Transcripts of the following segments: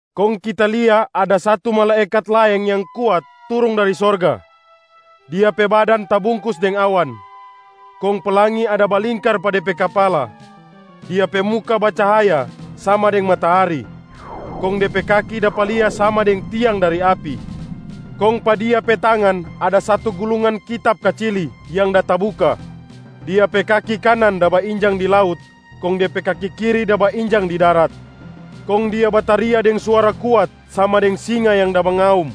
Kong kita lia ada satu malaekat laeng yang kuat turung dari sorga. Dia pe badan tabungkus deng awan, kong pelangi ada balingkar pa de pe kapala. Dia pe muka bacahaya sama deng matahari, kong de pe kaki dapa lia sama deng tiang dari api. Kong pa dia pe tangan ada satu gulungan kitab kacili yang da tabuka. Dia pe kaki kanan da bainjang di laut kong de pe kaki kiri da bainjang di darat. Kong dia bataria deng suara kuat sama deng singa yang da mengaum.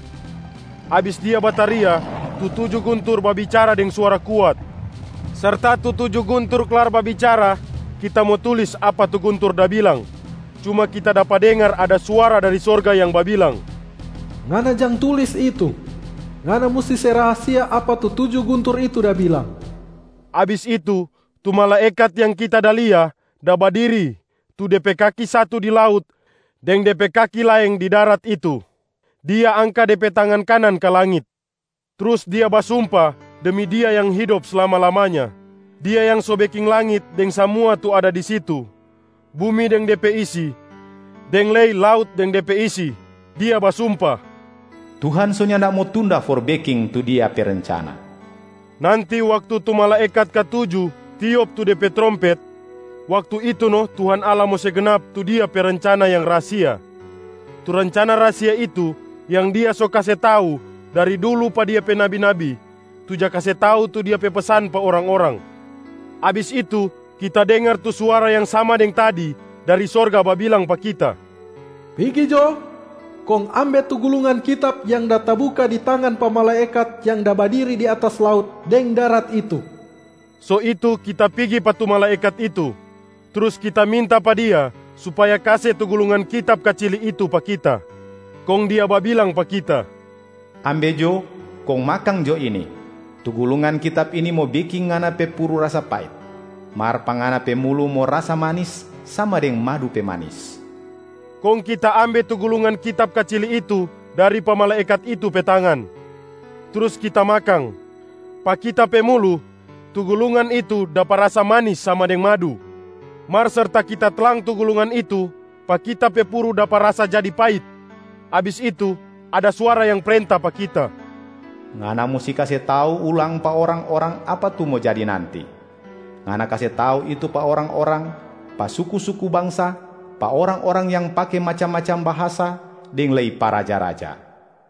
Abis dia bataria, tu tuju guntur babicara deng suara kuat. Serta tu tuju guntur klar babicara, kita mo tulis apa tu guntur da bilang, cuma kita dapa dengar ada suara dari sorga yang babilang, “Ngana jang tulis itu! Ngana musti se rahasia apa tu tuju guntur itu da bilang.” Abis itu, tu malaekat yang kita da lia da badiri tu de pe kaki satu di laut deng de pe kaki laeng di darat itu, dia angka de pe tangan kanan ka langit, trus dia basumpa demi Dia yang hidop slama-lamanya, Dia yang so beking langit deng samua tu ada di situ, bumi deng de pe isi, deng lei laut deng de pe isi. Dia basumpa, “Tuhan so nyanda mo tunda for beking tu Dia pe rencana.” Nanti waktu tu malaekat katuju tiop tu de pe trompet, waktu itu no Tuhan Allah mo se gnap tu Dia pe rencana yang rahasia. Tu rencana rahasia itu yang Dia so kase tau dari dulu pa Dia pe nabi-nabi tu ja kase tau Dia pe pesan pa orang-orang. Abis itu, kita dengar tu suara yang sama deng tadi dari sorga babilang pa kita, “Pigi jo kong ambe tu gulungan kitab yang da tabuka di tangan pa malaekat yang da badiri di atas laut deng darat itu.” So itu kita pigi pa tu malaekat itu, trus kita minta pa dia supaya kase tu gulungan kitab kacili itu pa kita. Kong dia babilang pa kita, “Ambe jo, kong makang jo ini! Tu gulungan kitab ini mo beking ngana pe puru rasa pait, mar pa ngana pe mulu mo rasa manis sama deng madu pe manis.” Kong kita ambe tu gulungan kitab kacili itu dari pa malaekat itu pe tangan, trus kita makang. Pa kita pe mulu, tu gulungan itu dapa rasa manis sama deng madu, mar serta kita tlang tu gulungan itu, pa kita pe puru dapa rasa jadi pait. Abis itu, ada suara yang prenta pa kita, “Ngana musti kase tau ulang pa orang-orang apa tu mo jadi nanti. Ngana kase tau itu pa orang-orang, pa suku-suku bangsa, pa orang-orang yang pake macam-macam bahasa, deng lei pa raja-raja.”